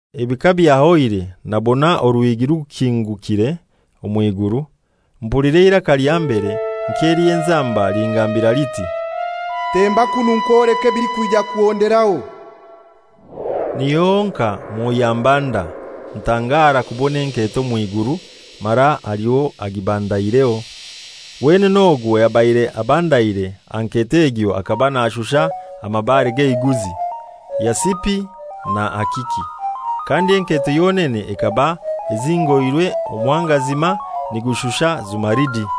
Ebi kabyahoire nabona oruhigi rukingukire omw'iguru. Mpulira eiraka lya mbere nk'ely'enzamba lingambira liti, «Temba kunu nkwoleke ebilikwija kuhonderaho.» Niho honkai Mwoyo ambanda, ntangara kubona enketo omw'iguru, mara haliho agibandaireho. Wenene ogwo ayabaire abandaire aha nketo egyo akaba nashusha amabare g'eiguzi: Yasipi na akiki, kandi enketo yonene ekaba ezingoirwe omuhangazima nigushusha zumaridi.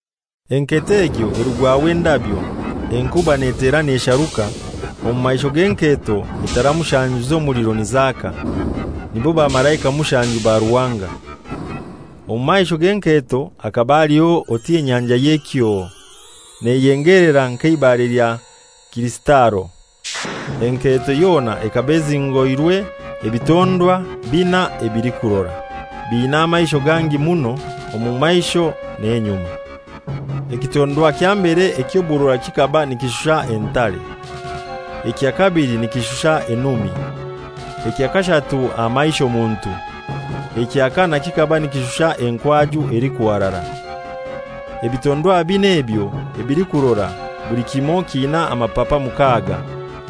Enketo egyo erugwaho endabyo, enkuba netera nesharuka, omu maisho g'enketo etara mushanju z'omuliro nizaka, nibo bamalaika mushanju ba Ruhanga. Omu maisho g'enketo hakaba haliho oti enyanja y'ekyoo, neyengelera nk'eibare lya kirisitalo. Enketo yona ekaba ezingoirwe ebitondwa bina ebilikurora, biina amaisho gangi muno omu maisho n'enyuma. Ekitondwa kya mbere eky'oburora kikaba nikishusha entare. Ekya kabili nikishusha enumi. Ekya kashatu aha maisho muntu. Ekya kanai kikaba nikishusha enkwaju elikuharara. Ebitondwa binai ebyo ebilikurora, buli kimoi kiina amapapa mukaaga,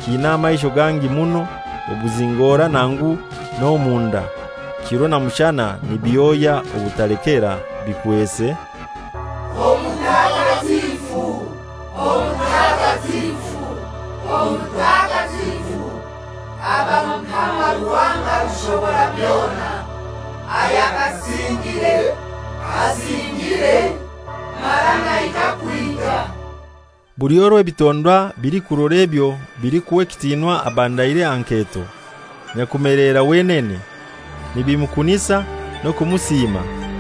kiina amaisho gangi muno obuzingora nangu n'omunda, kiro na mushana nibihoya obutalekera bikwese, «Omutakatifu, Omutakatifu, Omutakatifu, aba Mukama Ruhanga Rushoborabyona, ayakasingire, asingire, mara naija kwija!» Buli orwo ebitondwa bilikurora ebyo bilikuha ekitinwa abandaire aha nketo, Nyakumeleera wenene, nibimukunisa n'okumusiima,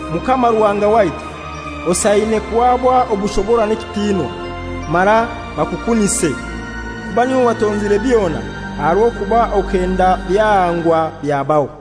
«Mukama Ruhanga waitu, osaine kuhaba obushobora n'ekitinwa, mara bakukunise, kuba n'iwe watonzire byona, aha rw'okuba okenda byahangwa, byabaho.»